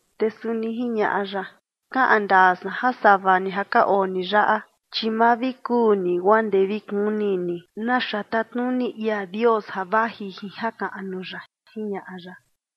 Te suni jiñaꞌa ya: ―Kaꞌan ndaa san ja sava ni ja ka oo ni yaꞌa, chi ma vi kuu ni guaa ndee vi kuni ni naxa tatnuni ia Dios ja vaji jin jakaꞌnu ya ―jiñaꞌa ya.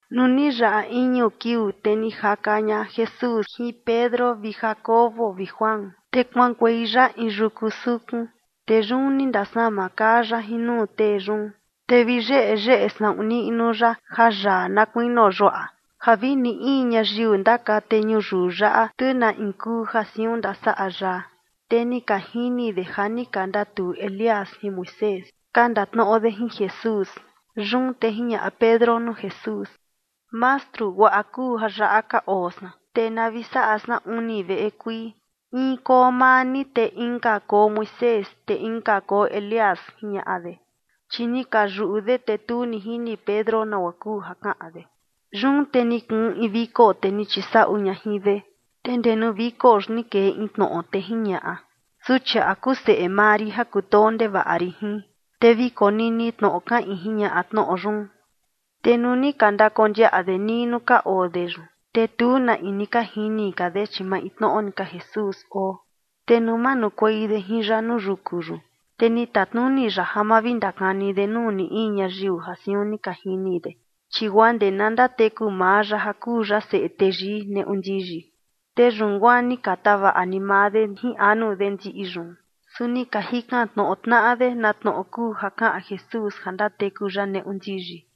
Nuu ni yaꞌa iñu kiuu, te ni jaka ña Jesús jin Pedro vi Jacobo vi Juan, te kuaꞌankuei ya in yuku sukun, te yun ni ndasama kaa ya jin nuu tee yun. Te vi yeyeꞌe saꞌun niꞌnu ya jayaa na kuinio yuaꞌa, ja vi ni in ñayiu ndakate ñuyiu yaꞌa, tu na in kuu ja siun ndasaꞌa yaa. Te ni ka jini de ja ni ka ndatuu Elías jin Moisés, ka ndatnoꞌo de jin Jesús. Yun te jiñaꞌa Pedro nuu Jesús: ―Mastru, guaꞌa kuu ja yaꞌa ka oo san, te na vi saꞌa san uni veꞌe kuii, in koo maa ni, te inka koo Moisés, te inka koo Elías ―jiñaꞌa de. Chi ni ka yuꞌu de, te tu ni jini Pedro nagua kuu ja kaꞌan de. Yun te ni kuun in viko, te ni chisaꞌu ña jin de, te ndee nuu viko yun ni kee in tnoꞌo, te jiñaꞌa: ―Suchiaꞌa kuu seꞌe maa rin ja kutoo ndevaꞌa rin jin, te vi konini tnoꞌo kaꞌin ―jiñaꞌa tnoꞌo yun. Te nuu ni ka ndakondiaꞌa de nii nuu ka oo de yun, te tu na in ni ka jini ka de, chi maintnoꞌo ni ka Jesús oo. Te nuu manukuei de jin ya nuu yuku yun, te ni tatnuni ya ja ma vi ndakani de nuu ni in ñayiu ja siun ni ka jini de, chi guaa ndee na ndateku maa ya ja kuu ya Seꞌe Teyii neꞌu ndiyi. Te yun guaa ni ka tavaꞌa ni maa de jin anu de ndiꞌi yun, su ni ka jikan tnoꞌo tnaꞌa de na tnoꞌo kuu ja kaꞌan Jesús ja ndateku ya neꞌu ndiyi.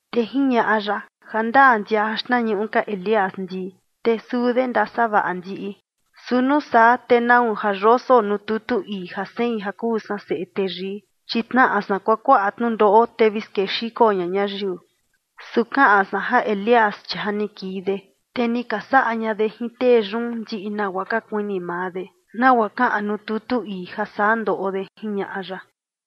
Te jiñaꞌa ya: ―Jandaa ndija ja xtnañuꞌu ka Elías ndii, te suu de ndasavaꞌa ndiꞌi. Su nuu saa, ¿te nau ja yoso nuu tutu ii ja sein ja kuu san Seꞌe Teyii, chi tnaꞌa san kuakuaꞌa tnundoꞌo, te vi skexiko ña ñayiu? Su kaꞌan san ja Elías, chi ja ni kii de, te ni ka saꞌa ña de jin tee yun ndiꞌi nagua ka kuini maa de, nagua kaꞌan nuu tutu ii ja saa ndoꞌo de ―jiñaꞌa ya.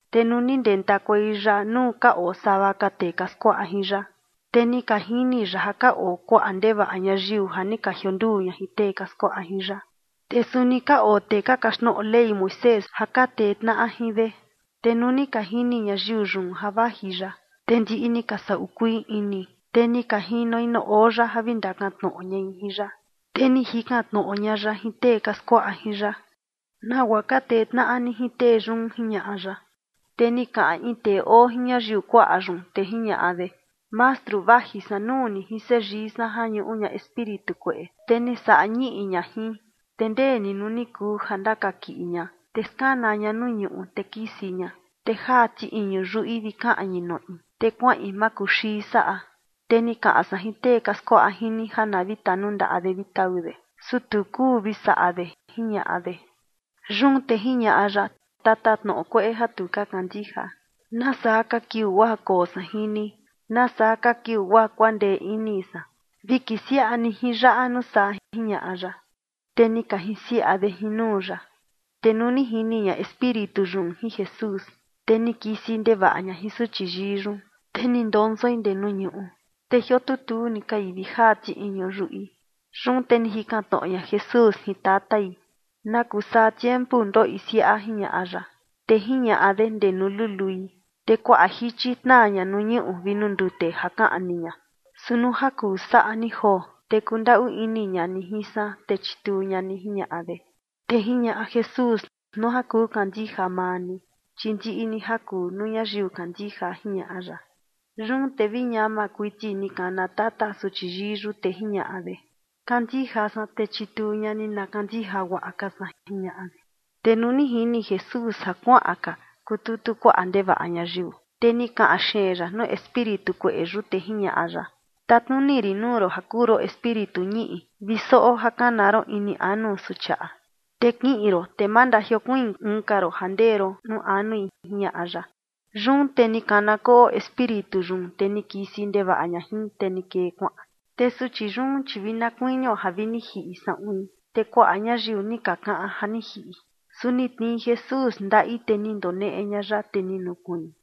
Te nuu ni ndentakuei ya nuu ka oo sava ka tee ka skuaꞌa jin ya, te ni ka jini ya ja ka oo kuaꞌa ndevaꞌa ñayiu ja ni ka jionduu ña jin tee ka skuaꞌa jin ya. Te suni ka oo tee ka kaxtnoꞌo Ley Moisés ja ka tee tnaꞌa jin de. Te nuu ni ka jini ñayiu yun ja vaji ya, te ndiꞌi ni ka saꞌu kuii ini, te ni ka jinoi nuu oo ya ja vi ndakantnoꞌo ñai jin ya. Te ni jikan tnoꞌo ña ya jin tee ka skuaꞌa jin ya: ―¿Nagua ka tee tnaꞌa ni jin tee yun? ―jiñaꞌa ya. Te ni kaꞌan in tee oo jin ñayiu kuaꞌa yun, te jiñaꞌa de: ―Mastru, vaji san nuu ni jin seyii san ja ñuꞌu ña espíritu kueꞌe, te ni saꞌa ñiꞌi ña jin. Te ndee ni nuu ni kuu ja ndakakiꞌi ña, te skana ña nuu ñuꞌu, te kisi ña, te jaa ti iñu yuꞌi vi kaꞌñi noꞌi, te kuaꞌin makuxii saꞌa. Te ni kaꞌan san jin tee ka skuaꞌa jin ni ja na vi tanundaꞌa de vi tau de, su tu kuu vi saꞌa de ―jiñaꞌa de. Yun te jiñaꞌa ya: ―Tatatnoꞌo kueꞌe ja tu ka kandija, ¿nasaa ka kiuu guaa koo san jin ni? ¿Nasaa ka kiuu guaa kuandee ini san? Vi kisiaꞌa ni jin yaꞌa nuu saa ―jiñaꞌa ya. Te ni ka jinsiaꞌa de jin nuu ya. Te nuu ni jini ña espíritu yun jin Jesús, te ni kisi ndevaꞌa ña jin suchi yii yun, te ni ndonsoi ndee nuu ñuꞌu, te jiotutuu ni kai vi jaa ti iñu yuꞌi. Yun te ni jikan tnoꞌo ña Jesús jin tatai: ―¿Na kuu saa tiempu ndoꞌi siaꞌa? ―jiñaꞌa ya. Te jiñaꞌa de: ―Ndee nuu lului. Te kuaꞌa jichi tnaa ña nuu ñuꞌu vi nuu ndute ja kaꞌni ña. Su nuu ja kuu saꞌa ni joo, te kundaꞌu ini ña ni jin san, te chituu ña ni ―jiñaꞌa de. Te jiñaꞌa Jesús: ―Nuu ja kuu kandija maa ni, chi ndiꞌi ni ja kuu nuu ñayiu kandija ―jiñaꞌa ya. Yun te vi ñama kuiti ni kana tata suchi yii yun, te jiñaꞌa de: ―Kandija san, te chituu ña ni na kandija guaꞌa ka san ―jiñaꞌa de. Te nuu ni jini Jesús ja kuaꞌan ka kututu kuaꞌa ndevaꞌa ñayiu, te ni kaꞌan xeen ya nuu espíritu kueꞌe yun, te jiñaꞌa ya: ―Tatnuni rin nuu ron ja kuu ron espíritu ñiꞌi vi soꞌo ja kana ron ini anu suchiaꞌa, te kiꞌin ron, te ma ndajiokuiin uun ka ron ja ndee ron nuu anui ―jiñaꞌa ya. Yun te ni kana koꞌo espíritu yun, te ni kisi ndevaꞌa ña jin, te ni kee kuaꞌan. Te suchi yun, chi vi na kuinio ja vi ni jiꞌi saꞌuin, te kuaꞌa ñayiu ni ka kaꞌan ja ni jiꞌi. Su ni tnii Jesús ndaꞌi, te ni ndoneꞌe ña ya, te ni nukuiin.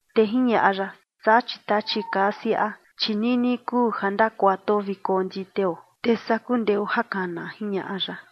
Te jiñaꞌa ya: ―Saa, chi tachi kaa siaꞌa, chi nini kuu ja ndakuatuo vi konditeo, te saa kundeo ja kana ―jiñaꞌa ya.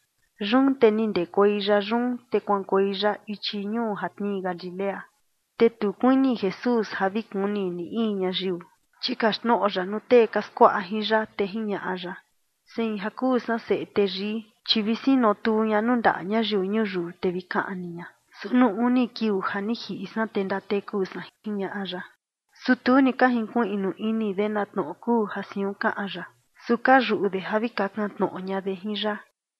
Yun te ni ndekuei ya yun, te kuaꞌankuei ya ichi ñuu ja tnii Galilea. Te tu kuini Jesús ja vi kuni ni in ñayiu. Chi kaxtnoꞌo ya nuu tee ka skuaꞌa jin ya, te jiñaꞌa ya: ―Sein ja kuu san Seꞌe Teyii, chi vi sinotuu ña nuu ndaꞌa ñayiu ñuyiu, te vi kaꞌni ña, su nuu uni kiuu ja ni jiꞌi san, te ndateku san ―jiñaꞌa ya. Su tu ni ka jinkuiꞌnu ini de na tnoꞌo kuu ja siun kaꞌan ya, su ka yuꞌu de ja vi kakan tnoꞌo ña de jin ya.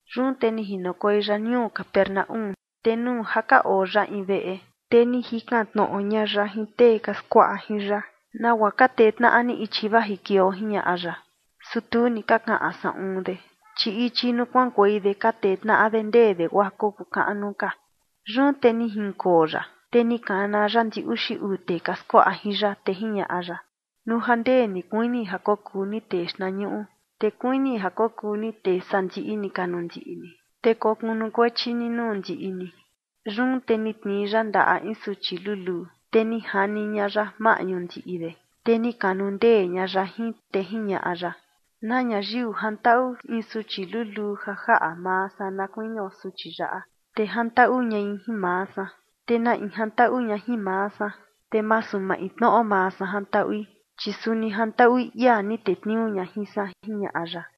Yun te ni jinokuei ya ñuu Capernaúm, te nuu ja ka oo ya in veꞌe, te ni jikan tnoꞌo ña ya jin tee ka skuaꞌa jin ya: ―¿Nagua ka tee tnaꞌa ni ichi vajikueio? ―jiñaꞌa ya. Su tu ni ka kaꞌan saꞌun de, chi ichi nuu kuaꞌankuei de ka tee tnaꞌa de ndee de guaa kokuu kaꞌnu ka. Yun te ni jinkoo ya, te ni kana ya ndi uxi uu tee ka skuaꞌa jin ya, te jiñaꞌa ya: ―Nuu ja ndee ni kuini ja kokuu ni tee xtnañuꞌu, te kuini ja kokuu ni tee sandiꞌi ni ka nuu ndiꞌi ni, te kokunukuechi ni nuu ndiꞌi ni. Yun te ni tnii ya ndaꞌa in suchi luluu, te ni jani ña ya maꞌñu ndiꞌi de, te ni kanundee ña ya jin, te jiñaꞌa ya: ―Na ñayiu jantaꞌu in suchi luluu ja jaꞌa maa san na kuinio suchi yaꞌa, te jantaꞌu ñai jin maa san. Te na in jantaꞌu ña jin maa san, te masu maintnoꞌo maa san jantaꞌui, chi suni jantaꞌui ia ni tetniuu ña jin san ―jiñaꞌa ya.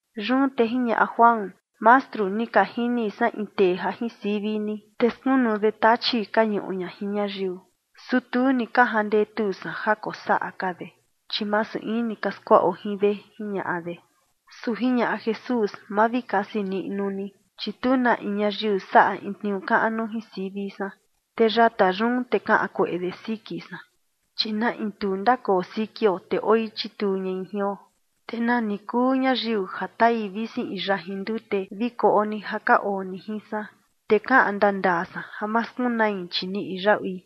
Yun te jiñaꞌa Juan: ―Mastru, ni ka jini san in tee ja jin sivi ni, te skunu de tachi ka ñuꞌu ña jin ñayiu, su tu ni ka jandetu san ja kosaꞌa ka de, chi masu in ni ka skuaꞌo jin de ―jiñaꞌa de. Su jiñaꞌa Jesús: ―Ma vi kasi niꞌnu ni, chi tu na in ñayiu saꞌa in tniuu kaꞌnu jin sivi san, te yata yun te kaꞌan kueꞌe de siki san. Chi na in tu ndakoo sikio, te oi chituu ñai jion. Te nani kuu ñayiu ja tai visi in yajin ndute vi koꞌo ni ja ka oo ni jin san, te kaꞌan ndandaa san ja ma skunai, chi niꞌi yaꞌui.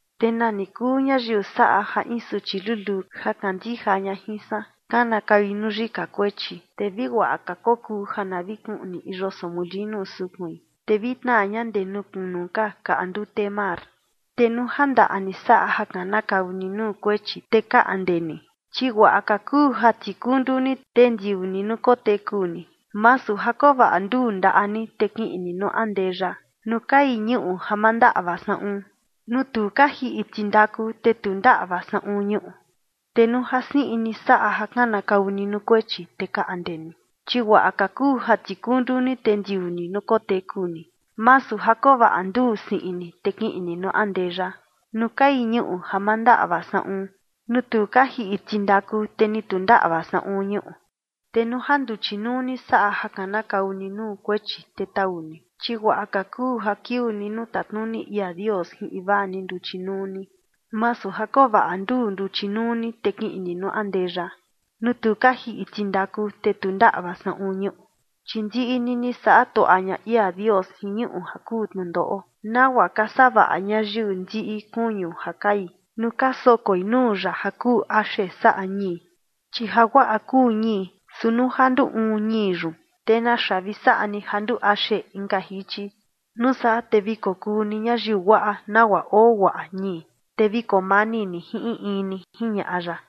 ’Te nani kuu ñayiu saꞌa ja in suchi luluu ja kandija ña jin san, kanakaui nuu yika kuechi, te vi guaꞌa ka kokuu ja na vi kuꞌni in yoso molinu sukuin, te vi tnaa ña ndee nuu kunu ka kaꞌa ndute mar. Te nuu ja ndaꞌa ni saꞌa ja kanakau ni nuu kuechi, te kaꞌnde ni, chi guaꞌa ka kuu ja tikundu ni, te ndiuu ni nuu koteku ni, masu ja koo vaꞌa nduu ndaꞌa ni, te kiꞌin ni nuu andeya, nuu kai ñuꞌu ja ma ndaꞌva saꞌun, nuu tu ka jiꞌi tindaku, te ni tu ndaꞌva saꞌun ñuꞌu. Te nuu ja siꞌin ni saꞌa ja kanakau ni nuu kuechi, te kaꞌnde ni, chi guaꞌa ka kuu ja tikundu ni, te ndiuu ni nuu koteku ni, masu ja koo vaꞌa nduu siꞌin ni, te kiꞌin ni nuu andeya, nuu kai ñuꞌu ja ma ndaꞌva saꞌun, nuu tu ka jiꞌi tindaku, te ni tu ndaꞌva saꞌun ñuꞌu. Te nuu ja nduchi nuu ni saꞌa ja kanakau ni nuu kuechi, te tau ni, chi guaꞌa ka kuu ja kiuu ni nuu tatnuni ia Dios jin invaa ni nduchi nuu ni, masu ja koo vaꞌa nduu nduchi nuu ni, te kiꞌin ni nuu andeya, nuu tu ka jiꞌi tindaku, te ni tu ndaꞌva saꞌun ñuꞌu. Chi ndiꞌi ni ni saꞌa tuaꞌa ña ia Dios jin ñuꞌu ja kuu tnundoꞌo, nagua ka savaꞌa ñayiu ndiꞌi kuñu ja kai nuu ka sokoi nuu ya ja kuu axe saꞌa ñii. Chi jaguaꞌa kuu ñii, su nuu ja na nduu uun ñii yun, ¿te naxa vi saꞌa ni ja nduu axe inka jichi? Nuu saa, te vi kokuu ni ñayiu guaꞌa nagua oo guaꞌa ñii, te vi koo mani ni jin in in ni ―jiñaꞌa ya.